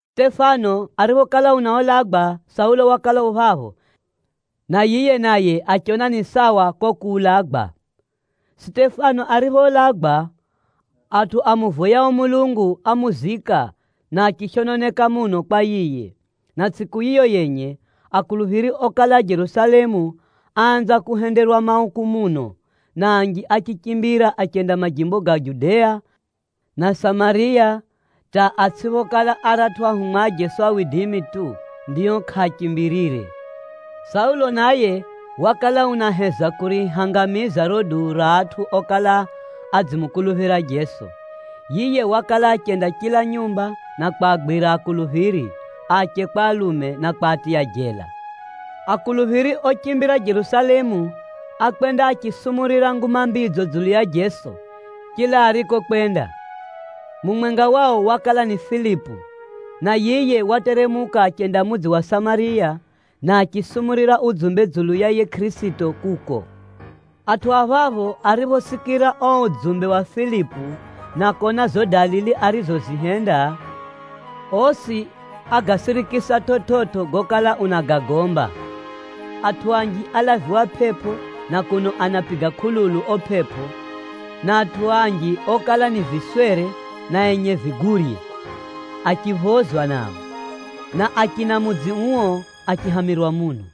Sitefano ariphokala unaulagwa, Saulo wakala u phapho, na yiye naye achiona ni sawa ko kuulagwa. Akuluphiri anatsamukana kwa kuhenderwa mauku Sitefano ariphoulagwa, atʼu amuvoyao Mulungu ámuzika, na achishononeka muno kwa yiye. Na tsʼiku yiyo yenye, akuluphiri okala a Jerusalemu, áanza kuhenderwa mauku muno, na anji achichimbira achenda majimbo ga Judea na Samariya hata atsʼiphokala aratʼu ahumwa a Jeso tu, ndio kʼaachimbirire. Saulo naye wakala unaheza kurihangamiza riro duu ra atʼu okala adzimukuluphira Jeso. Yiye wakala achenda chila nyumba na kwagwira akuluphiri, ache kwa alume, na kwaphirika jela. Akuluphiri ochimbira Jerusalemu, ákwenda achisumurira Nguma Mbidzo dzulu ya Jeso, chila arikokwenda. Mumwenga wao wakala ni Filipu, na yiye wateremuka achenda mudzi wa Samariya, na achisumurira udzumbe dzulu ya yiye Kʼirisito kuko. Atʼu a phapho ariphosikira o udzumbe wa Filipu na kona zo dalili arizozihenda, osi ágasirikisa chividzo gokala unagagomba. Atʼu anji álaviwa pʼepʼo na kuno anapiga kʼululu o pʼepʼo, na atʼu anji okala ni viswere na enye vigurye, achiphozwa nao. Na achina mudzi uo achihamirwa muno.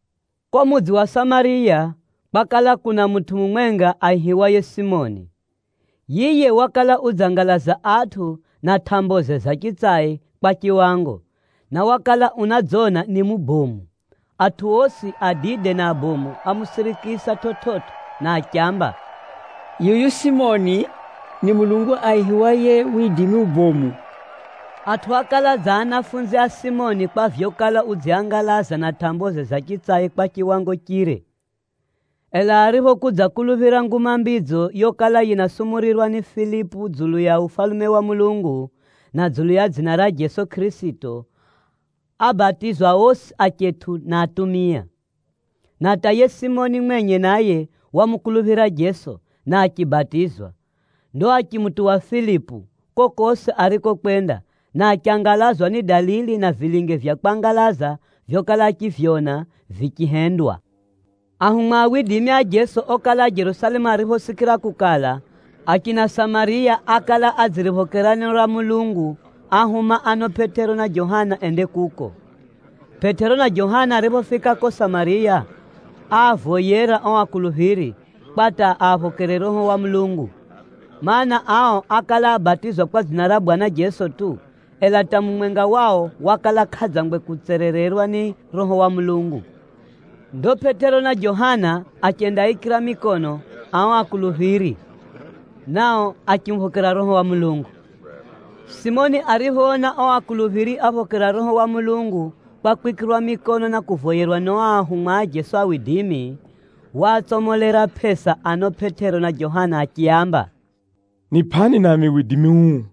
Ko mudzi wa Samariya, kwakala kuna mutʼu mumwenga aihiwaye Simoni. Yiye wakala udzangalaza atʼu na tʼamboze za chitsai kwa chiwango, na wakala unadzona ni mubomu. Atʼu osi, adide na abomu ámusirikisa chividzo na achiamba, “Yuyu Simoni ni mulungu aihiwaye ‘Widimi ubomu.’” Atʼu ákala dza anafunzi a Simoni kwa vyokala udziaangalaza na tʼamboze za chitsai kwa chiwango chire. Ela ariphokudzakuluphira Nguma Mbidzo yokala yinasumurirwa ni Filipu dzulu ya Ufalume wa Mulungu, na dzulu ya dzina ra Jeso Kʼirisito, ábatizwa osi achetʼu na atumia. Na hata yiye Simoni mwenye naye wamukuluphira Jeso, na achibatizwa. Ndo achimutuwa Filipu, kokosi arikokwenda, na achangalazwa ni dalili na vilinge vya kwangalaza vyokala achivyona vichihendwa. Ahumwa a Jeso okala a Jerusalemu ariphosikira kukala, achina Samariya ákala adziriphokera neno ra Mulungu, áahuma ano Pʼetero na Johana ende kuko. Pʼetero na Johana ariphofika ko Samariya, áavoyera o akuluphiri, kwa hata aphokere Roho wa Mulungu. Maana, ao ákala abatizwa kwa dzina ra Bwana Jeso tu, ela hata mumwenga wao wakala kʼadzangwe kutserererwa ni Roho wa Mulungu. Ndo Pʼetero na Johana achendaaikira mikono ao akuluphiri, nao achimuphokera Roho wa Mulungu. Simoni ariphoona o akuluphiri aphokera Roho wa Mulungu kwa kwikirwa mikono na kuvoyerwa ni o ahumwa a Jeso, waatsomolera pʼesa ano Pʼetero na Johana achiaamba, “Nipʼani nami widimi uu,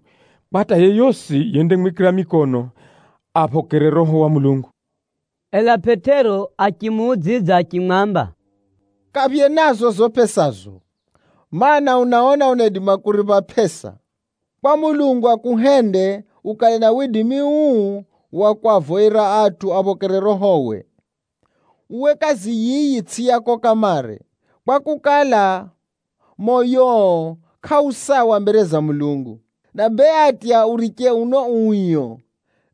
kwa hata yeyosi yendamwikira mikono, aphokere Roho wa Mulungu.” Ela Pʼetero achimuudzidza achimwamba, “Kaphye nazo zo pʼesazo! Maana, unaona unaidima kuripha pʼesa, kwa Mulungu akuhende ukale na widimi uu wa kwavoyera atʼu aphokere Rohowe! Uwe kazi yiyi tsʼi yako kamare, kwakukala, moyoo kʼau sawa mbere za Mulungu. Na bee atya uriche uno uio,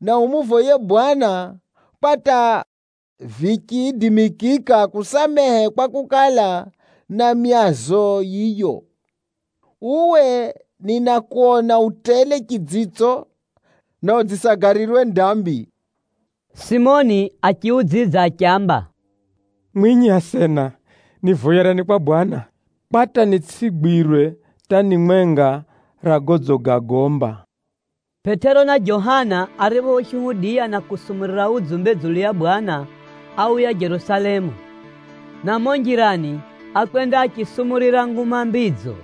na umuvoye Bwana kwa hata vichiidimikika akusamehe kwakukala na myazo yiyo. Uwe ninakona u tele chidzitso, na udzisagalirwa ni dambi.” Simoni achiudzidza achiamba, “Mwinyi asena, nivoyerani kwa Bwana, kwa hata nitsʼigwirwe hata ni mwenga ra godzigagomba.” Pʼetero na Johana ariphoshuhudiya na kusumurira udzumbe dzulu ya Bwana, áuya Jerusalemu. Na mumo njirani, ákwenda achisumurira Nguma Mbidzo,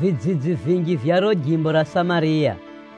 vidzidzi vinji vya riro jimbo ra Samariya.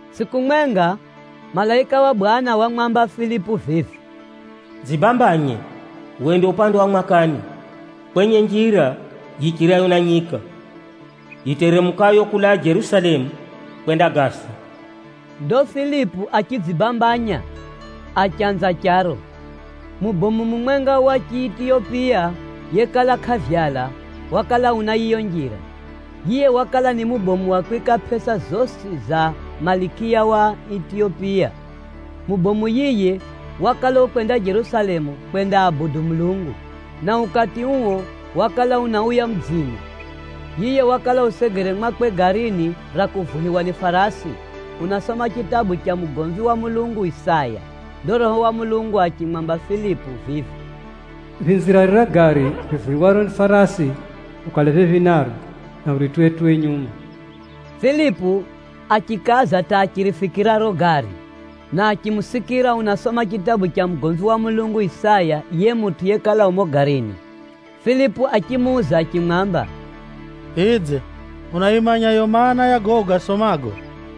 Tsʼiku mwenga, malaika wa Bwana wamwamba Filipu vivi, “Dzibambanye, wende upande wa mwakani, kwenye njira yichirayo na nyika, yiteremukayo kulaa Jerusalemu kwenda Gaza.” Ndo Filipu achidzibambanya, achanza charo. Mubomu mumwenga wa Chiitiyopiya yekala kʼavyala, wakala una yiyo njira. Yiye wakala ni mubomu wa kwika pʼesa zosi za Malikiya wa Itiyopiya. Chiyunani chinaamba Kandake ririro ni dzina ra cheo. Mubomu yiye wakala ukwenda Jerusalemu kwendaabudu Mulungu, na ukati uo wakala unauya mudzini. Yiye wakala usegere mwakwe garini ra kuvuhiwa ni farasi, unasoma chitabu cha mugomvi wa Mulungu Isaya. Ndo Roho wa Mulungu achimwamba Filipu vivi, “Phinzira rira gari rivuhiwaro ni farasi ukale phephi naro, na urituwe-tuwe nyuma.” Filipu achikaza hata achirifikira riro gari, na achimusikira unasoma chitabu cha mugomvi wa Mulungu Isaya, yiye mutʼu yekala u mumo garini. Filipu achimuuza achimwamba, “Vidze unayimanya yo maana, ya gago ugasomago?”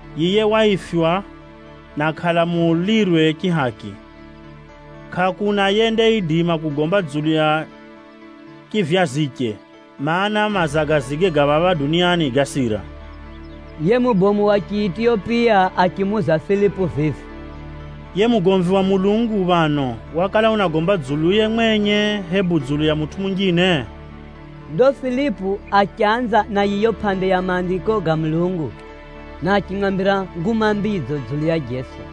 Yiye waifywa, na kʼalamulirwe chihaki. Kʼakuna mutʼu yendaidima kugomba dzulu ya chivyaziche, kwakukala, mazagazige ga phapha duniani gasira.” Yiye mubomu wa Chiitiyopiya achimuuza Filipu vivi, “Yiye mugomvi wa Mulungu phano, wakala unagomba dzuluye mwenye, hebu dzulu ya mutʼu munjine?” Ndo Filipu achanza na yiyo pʼande ya Maandiko ga Mulungu, na achimwambira Nguma Mbidzo dzulu ya Jeso.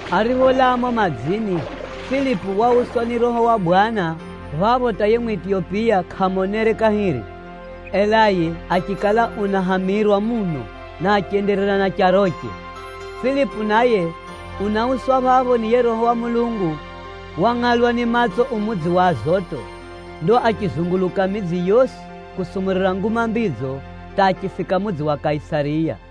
Aripholaa mumo madzini, Filipu wauswa ni Roho wa Bwana phapho hata yiye Mwitiyopiya kʼamonere kahiri. Ela yiye achikala unahamirwa muno, na achenderera na charoche. Filipu naye unauswa phapho ni yiye Roho wa Mulungu, wangʼalwa ni matso u mudzi wa Azoto. Ndo achizunguluka midzi yosi kusumurira Nguma Mbidzo hata achifika mudzi wa Kaisariya.